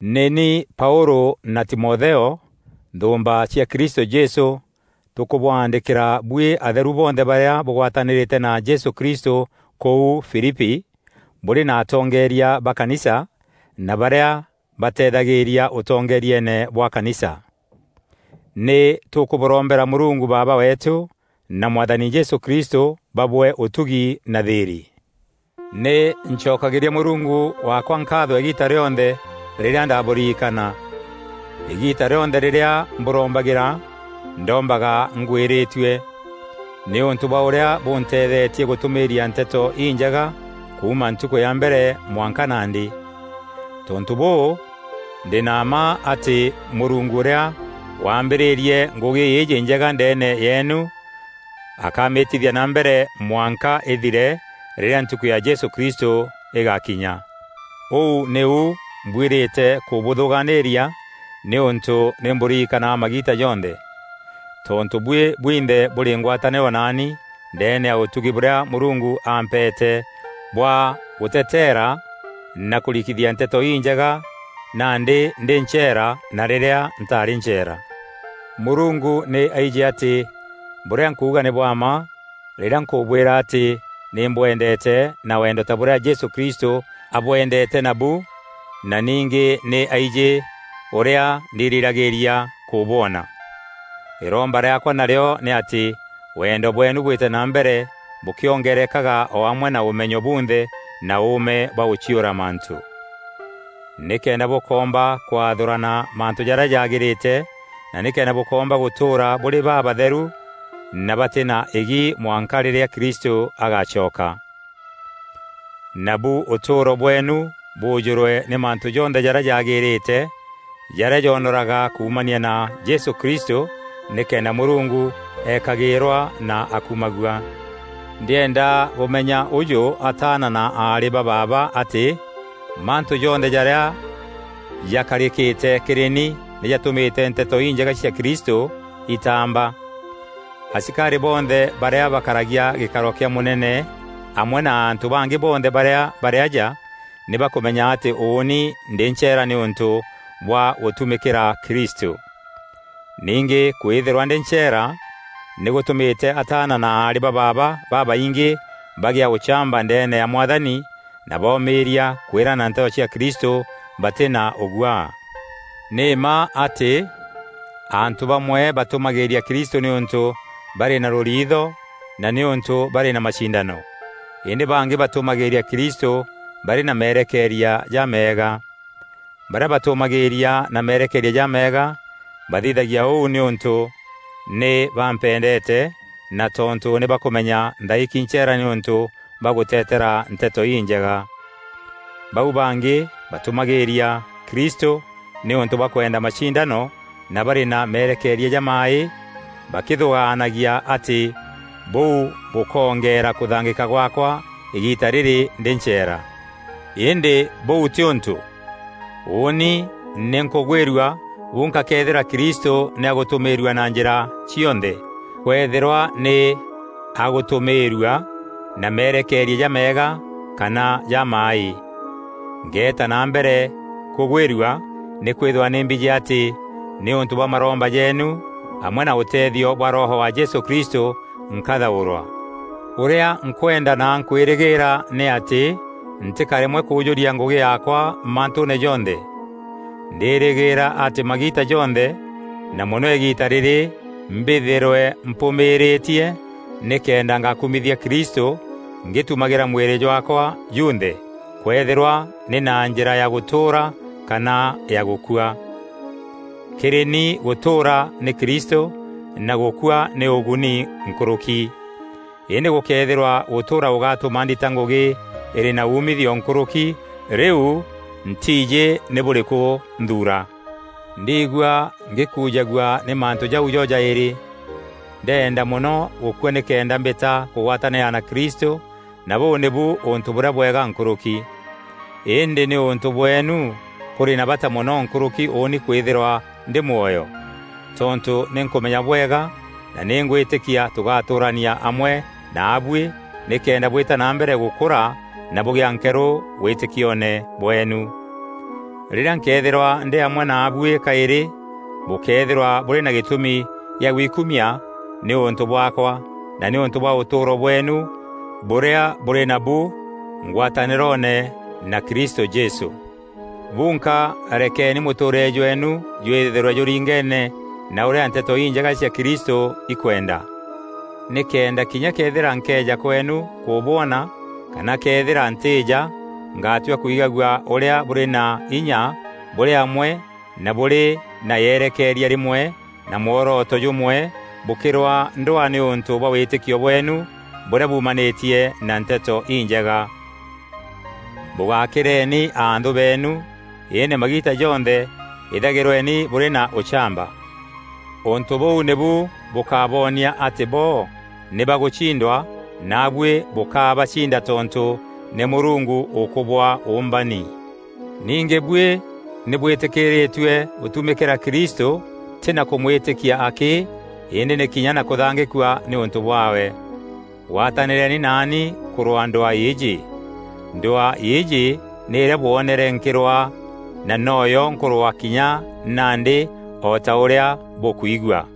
Nî ni Paûlû na Timotheo, nthûûmba cia Kristû Jesû tûkûbwaandîkîra buî atheru bonthe barîa bûgwatanîrîte na Jesû Kristû kûu Filipi, bûrî na atongeeria ba kanisa na barîa bateethagîîria ûtongerieene bwa kanisa. Nî tûkûbûrombera Mûrungu Baaba weetû na Mwathani Jesû Kristû babwee ûtugi na thîîrî. Nî ncokagîria Mûrungu waakwa nkaatho îgiita rîonthe rîrîa ndabûririkana. Îgiita rîonthe rîrîa mbûrombagîra, ndombaga ngwîrîtue, nîûntû bwa ûrîa bûnteethetie gûtûmîîria Nteto Injega kuuma ntukû ya mbere mwanka nandî. Tontû bûû, ndî na mma atî Mûrungu ûrîa waambîrîrie ngûgî îîjî njega ndeene yeenu akamîtithia na mbere mwanka îthire rîrîa ntukû ya Jesû Kristû îgakinya. Ûu nîu mbwîrîte kûbûthûgaanîria, nîûntû nî mbûririkanaga magiita jonthe. Tontû buî bwinthe bûrî ngwatanîro naani ndeene ya ûtugi bûrîa Mûrungu aampeete bwa gûteteera na kûrikithia Nteto Injega nandî ndî ncheera na rîrîa ntarî ncheera. Mûrungu nî aijî atî bûrîa nkuuga nî bwa mma rîrîa nkûbwîra atî nî mbwendeete na wendo ta bûrîa Jesû Kristû abwendeete nabu na ningî nî aijî ûrîa ndirîragîîria kûbwona. Îromba rîaakwa narîo nî atî wendo bweenu bwîte na mbere bûkîongerekaga o amwe na ûmenyo bunthe na ûûme bwa gûciûra mantû. Nîkenda bûkoomba kwathûrana mantû jarîa jaagîrîte na nîkenda bûkoomba gûtûûra bûrî babatheru na batî na îgi mwanka rîrîa Kristû agacoka. Nabu ûtûûro bweenu bûjûrwe nî mantû jonthe jarîa jaagîrîte, jarîa joonoraga kuumania na Jesû Kristû, nîkenda Mûrungu eekagîîrwa na akumagua. Ndîenda bûmenya ûjû ataana na aarî ba baaba atî, mantû jonthe jarîa jakarîkîte kîrî ni nî jatûmîte Nteto Injega cia Kristû itaamba. Asikarî bonthe barîa bakaragia gîkaro kîa mûnene amwe na antû bangî bonthe barîa barî aja nî bakûmenya atî ûûni ndî ncheera nîûntû bwa gûtumîkîra Kristû. Ningî kwîthîrwa ndî ncheera, nî gûtûmîte ataana na aarî ba baaba babaingî bagîa ûchamba ndeene ya Mwathani na boomîîria kwîrana Nteto cia Kristû batî na ûguaa. Nî mma atî, antû bamwe batûmagîîria Kristû nîûntû barî na rûriitho na nîûntû barî na macindano; îndî bangî batûmagîîria Kristû barî na merekeeria jameega. Barîa batûmagîîria na merekeeria jameega bathithagia ûu nîûntû nî bampendeete na tontû nî bakûmenya nthaîki ncheera nîûntû bwa gûteteera Nteto Injega. Bau bangî batûmagîîria Kristû nîûntû bwa kwenda macindano na barî na merekeeria jamaaî, bakîthûgaanagia atî bûu bûkoongeera kûthangîka gwaakwa îgiita rîrî ndî ncheera. Îndî bûu tî ûntû! Ûûni nî nkûgwîrua bunka këethîra Kristû nî agûtûmîîrua na njîra cionthe, kwëethîrwa nî agîtûmîîrua na merekeeria jameega kana jamaaî. Ngeeta na mbere kûgwîrua, nîkwîthîrwa nî mbijî atî nîûntû bwa maromba jeenu amwe na ûteethio bwa Roho wa Jesû Kristû nkathaûrwa. Ûrîa nkwenda na nkwîrîgîîra nî atî ntîkaremwe kûjûria ngûgî yaakwa mantûûne jonthe. Ndîrîgîîra atî magiita jonthe, na mono îgiita rîrî mbîthîrwe mpûmîîrîtie nîkenda ngakumithia Kristû ngîtumagîra mwîrî jwaakwa junthe, kwëethîrwa nî na njîra ya gûtûûra kana ya gûkua. Kîrî ni gûtûûra nî Kristû na gûkua nî ûguni nkûrûki. Îndî gûkëethîrwa gûtûûra gûgatûma ndita ngûgî îrî na umithio nkûrûki, rîu ntiijî nî bûrîkû nthuura! Ndiigua ngîkuujagua nî mantû jau jo jaîrî. Ndenda mono gûkua nîkenda mbîta kûgwatanîra na Kristû na bûû nîbu ûntû bûrîa bwega nkûrûki. Îndî nîûntû bweenu, kûrî na bata mono nkûrûki ûûni kwîthîrwa ndî mwoyo. Tontû nî nkûmenya bwega na nî ngwîtîkia tûgatûûrania amwe naabuî, nîkenda bwîta na mbere gûkûra na bûgîa nkerû wîtîkioone bweenu. Rîrîa nkëethîrwa ndî amwe naabuî kaîrî, bûkeethîrwa bûrî na gîtûmi gîa gwikumia nîûntû bwaakwa na nîûntû bwa ûtûûro bweenu bûrîa bûrî nabu ngwatanîroone na Kristû Jesû. Bunka rekeni mûtûûrîre jweenu jwîthîrwe jûringeene na ûrîa Nteto Înjega cia Kristû ikwenda. Nîkenda kinya këethîra nkeeja kweenu kûbwona kana këethîrwa ntîîja, ngatua kwigagua ûrîa bûrî na inya bûrî amwe na bûrî na yerekeeria rîmwe na mworoto jûmwe bûkîrwaa ndwaa nîûntû bwa wîtîkio bweenu bûrîa buumanîtie na Nteto Injega. Bûgakîreeni anthû beenu, îndî magiita jonthe îthagîrweni bûrî na ûchamba. Ûntû bûu nîbu bûkaboonia atî bo nî ba gûcindwa naabuî bûkabacinda tontû nî Mûrungu ûkûbwaa ûûmbani. Ningî buî nî bwîtîkîîrîtue gûtumîkîra Kristû tî na kûmwîtîkia akî, îndî nî kinya na kûthangîkua nîûntû bwaawe. Gwatanîreeni naani kûrwaa ndwaa îîjî. Ndwaa îîjî nî îrîa bwoonere nkîrwaa na noyo nkûrwaa kinya nandî o ta ûrîa bûkwigua.